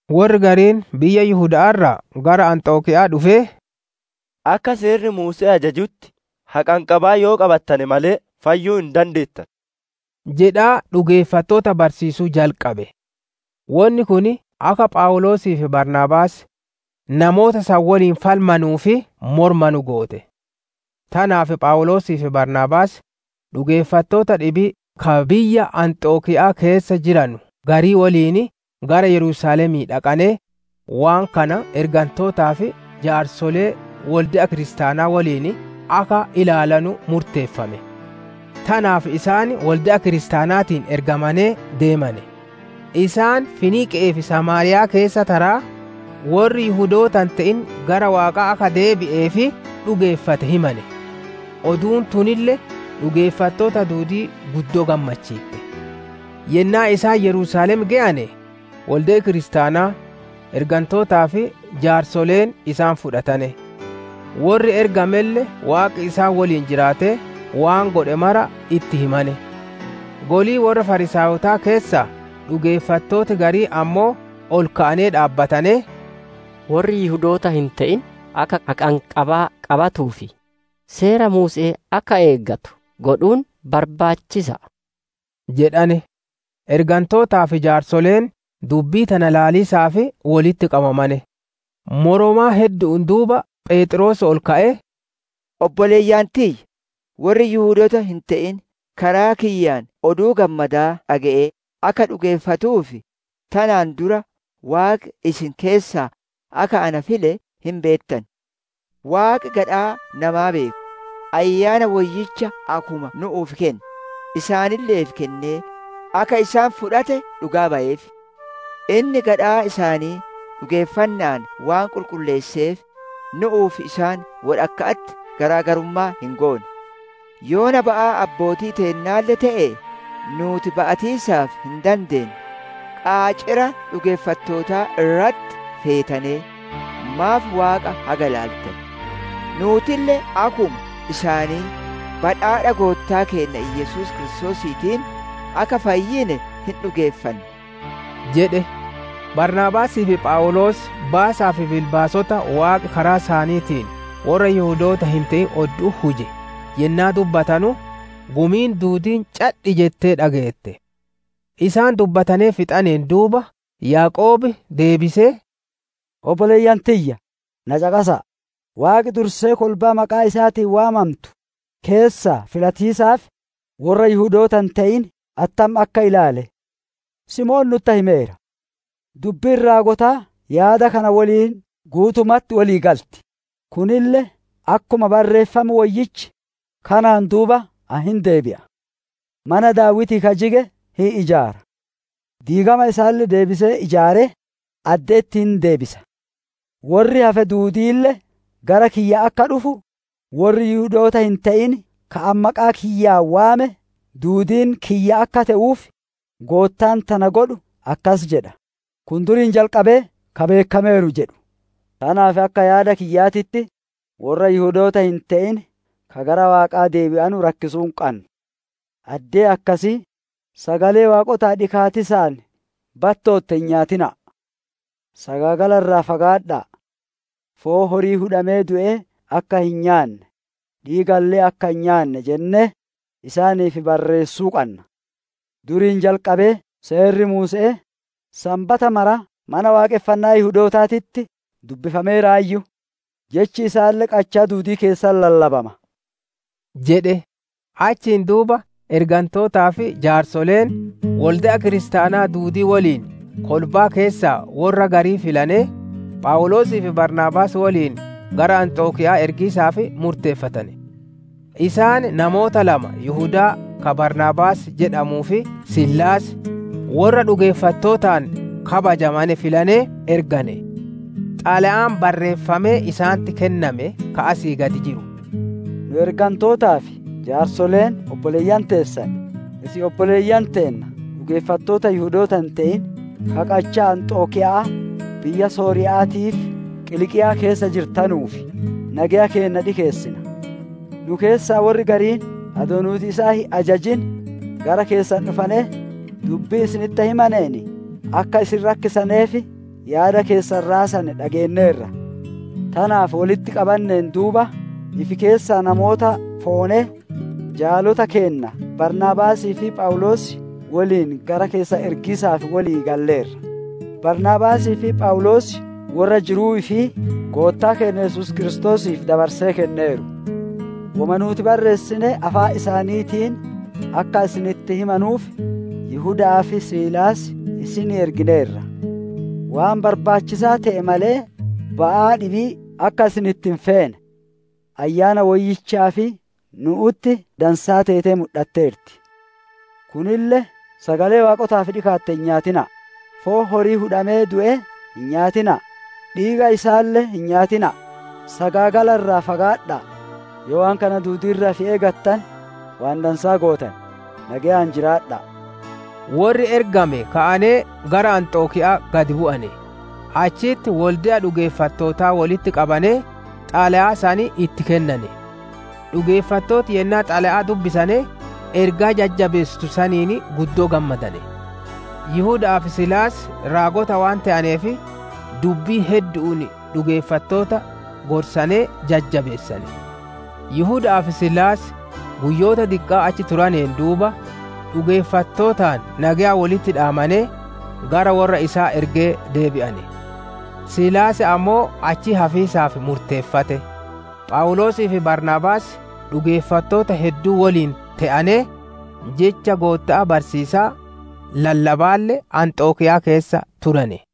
Worri gariin biyya Yihuda'aa irraa gara Anxokiya'aa dhufee, «Akka Seerri Muuse'ee ajajutti haqanqabaa yoo qabatane malee, fayyuu hin dandeettanu» jedhaa dhugeeffattoota barsiisuu jalqabe. Wonni kun akka Phawuloosii fi Baarnaabaas, namoota san woliin falmanuu fi moromanu goote. Tanaaf Phawuloosii fi Baarnaabaas dhugeeffattoota dhibii ka biyya Anxokiya'aa keessa jiranu garii woliin gara Yerusaalemii dhaqanee, waan kana ergantootaa fi jaarsolee wolde'a kiristaanaa woliin akka ilaalanu murteeffame. Tanaaf isaan wolde'a kiristaanaatiin ergamanee deemane; isaan Finiiqe'ee fi Samaariyaa keessa taraa, worri Yihudoota hin te'in gara Waaqaa akka deebi'ee fi dhugeeffate himane. Oduun tunille dhugeeffattoota duudii guddoo gammachiitte. Yennaa isaan Yerusaalem geyane, wolde'i kiristaanaa, ergantootaa fi jaarsoleen isaan fudhatane; worri ergamelle Waaqi isaan woliin jiraatee waan godhe mara itti himane. Golii worra Fariisaayotaa keessaa dhugeeffattooti gariin ammoo ol ka'anee dhaabbatanee, «Worri Yihudoota hin te'in akka haqanqabaa qabatuu fi Seera Muuse'ee akka eegatu godhuun barbaachisa'a» jedhane. Ergantootaa fi jaarsoleen dubbii tana ilaaliisaaf wolitti qabamane. Moromaa heddu'uun duuba Pheexroos ol ka'ee, «Obboleeyyan tiyya, worri Yihudoota hin te'in karaa kiyyaan Oduu Gammadaa dhage'ee akka dhugeeffatuuf, tanaan dura Waaqi isin keessaa akka na file hin beettan. Waaqi gadhaa namaa beeku, Ayyaana Woyyicha akkuma nu'uuf kenne, isaanille'eef kennee akka isaan fudhate dhugaa bayeef. Inni gadhaa isaanii dhugeeffanna'aan waan qulqulleesseef, nu'uu fi isaan wodhakka'atti garaa garummaa hin goone. Yoona ba'aa abbootii teennaalle te'e nuuti ba'atiisaaf hin dandeenne, qaacira dhugeeffattootaa irratti feetanee, maaf Waaqa haga ilaaltan? Nuutille akkuma isaanii, badhaadha Goottaa keenna Yesuus Kiristoosiitiin akka fayyine hin dhugeeffanna» jedhe. Baarnaabaasii fi Phawuloos baasaa fi bilbaasota Waaqi karaa isaaniitiin worra Yihudoota hin te'in oddu'utti huje yennaa dubbatanu, gumiin duudiin cadhi jettee dhageette. Isaan dubbatanee fixataneen duuba Yaaqoob deebisee, «Obboleeyyan tiyya, na caqasa'a! Waaqi dursee kolbaa maqaa isaatiin waammantu keessaa filatiisaaf, worra Yihudoota hin te'in attam akka ilaale, Simoon nutti himeera. Dubbiin raagotaa yaada kana woliin guutumatti wolii galti; kunille akkuma Barreeffam Woyyichi, «‹Kanaan duuba ani hin deebi'a; mana Daawitii ka jige hin ijaara; diigama isaalle deebisee ijaaree, adde'etti hin deebisa. Worri hafe duudiille gara kiyya akka dhufu, worri Yihudoota hin te'in ka ani maqaa kiyyaan waame duudiin kiyya akka te'uuf, Goottaan tana godhu akkas jedha. Kun duriin jalqabee ka beekkameeru› jedhu. «Tanaaf akka yaada kiyyaatitti, worra Yihudoota hin te'in ka gara Waaqaa deebi'anu rakkisuu hin qannu. Addee akkasii, sagalee waaqotaaf dhikaatiisaan battootte hin nyaatina'a; sagaagala irraa fagaadha'a; foon horii hudhamee du'ee akka hin nyaanne, dhiigalle akka hin nyaanne jennee, isaaniif barreessuu qanna. Duriin jalqabee Seerri Muuse'ee sanbata mara Mana Waaqonfannaa Yihudootaatitti dubbifameeraayyu; Jechi isaalle qachaa duudii keessatti lallabama» jedhe. Achiin duuba ergantootaa fi jaarsoleen, wolde'a kiristaanaa duudii woliin kolbaa keessaa worra garii filanee, Phawuloosii fi Baarnaabaas woliin gara Anxokiya'aa ergiisaaf murteeffatane. Isaan namoota lama Yihudaa ka Baarnaabaas jedhamuu fi Siilaas, worra dhugeeffattootaan kabajamane filanee ergane. Xalayaan barreeffamee isaanitti kenname ka asii gad jiru: «Nu ergantootaa fi jaarsoleen obboleeyyan teessan, isin obboleeyyan teenna dhugeeffattoota Yihudoota hin te'in ka qachaa Anxokiya'aa, biyya Sooriya'aatii fi Qiliiqiyaa keessa jirtanuuf nageya keenna dhikeessina. Nu keessaa worri gariin adoo nuuti isaan hin ajajin, gara keessan dhufanee, dubbii isinitti himaneen akka isin rakkisanee fi yaada keessan raasane dhageenneerra. Tanaaf wolitti qabanneen duuba, ifi keessaa namoota foonee, jaalota keenna Baarnaabaasii fi Phawuloos woliin gara keessan ergiisaaf wolii galleerra. Baarnaabaasii fi Phawuloos worra jiruu ifii Goottaa keenna Yesuus Kiristoosiif dabarsee kenneeru. Woma nuuti barreessine, afaan isaaniitiin akka isinitti himanuuf, Yihudaa fi Siilaas isinii ergineerra. Waan barbaachisaa te'e malee, ba'aa dhibii akka isinitti hin feene, Ayyaana Woyyichaa fi nu'utti dansaa teetee mudhatteerti. Kunille: sagalee waaqotaaf dhikaatte hin nyaatina'a; foon horii hudhamee du'ee hin nyaatina'a; dhiiga isaalle hin nyaatina'a; sagaagala irraa fagaadha'a; yoo waan kana duudii irraa ifi eegattane, waan dansaa gootan; nageyaan jiraadha'a.» Worri ergame ka'anee gara Anxokiya'aa gad bu'ane; achitti wolde'a dhugeeffattootaa wolitti qabanee, xalayaa san itti kennane. Dhugeeffattooti yennaa xalayaa dubbisane, ergaa jajjabeessitu saniin guddoo gammadane. Yihuda'aa fi Siilaas raagota waan te'aneef, dubbii heddu'uun dhugeeffattoota gorsanee jajjabeessane. Yihuda'aa fi Siilaas guyyoota diqqaa achi turaneen duuba, dhugeeffattootaan nageya wolitti dhaamanee, gara worra isaan ergee deebi'ane. [ Siilaas ammoo achitti hafiisaaf murteeffate.] Phawuloosii fi Baarnaabaas dhugeeffattoota hedduu woliin te'anee, Jecha Gootta'aa barsiisaa, lallabaalle Anxokiyaa keessa turane.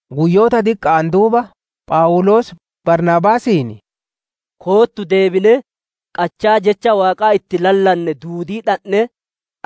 Guyyoota diqqa'aan duuba Phawuloos, Baarnaabaasiin, «Koottu deebinee, qachaa Jecha Waaqaa itti lallanne duudii dhandhee,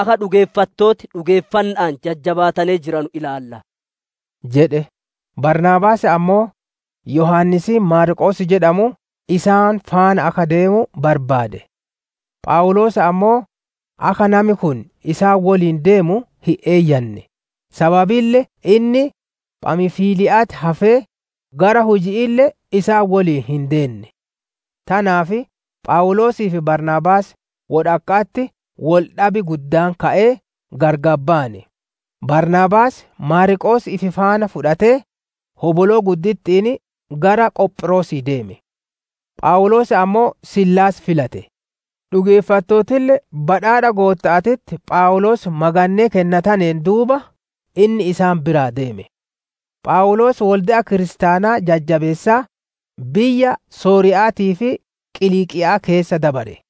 akka dhugeeffattooti dhugeeffanna'aan jajjabaatanee jiranu ilaalla» jedhe. Baarnaabaas ammoo, Yohaannisiin Maarqoos jedhamu isaan faana akka deemu barbaade. Phawuloos ammoo, akka nami kun isaan woliin deemu hin eeyyanne; sababille inni Phamfiliya'atti hafee, gara huji'iille isaan woliin hin deenne. Tanaaf Phawuloosii fi Baarnaabaas wodhakka'atti wol dhab guddaan ka'ee gargar bayane; Baarnaabaas, Maarqoos ifi faana fudhatee, hoboloo gudditti'iin gara Qophiroosii deeme. Phawuloos ammoo, Siilaas filate; dhugeeffattootille badhaadha Gootta'aatitti Phawuloos magannee kennataneen duuba, inni isaan biraa deeme. Phawuloos wolde'a kiristaanaa jabeessaa, biyya Sooriya'aatii fi Qiliiqiya'aa keessa dabare.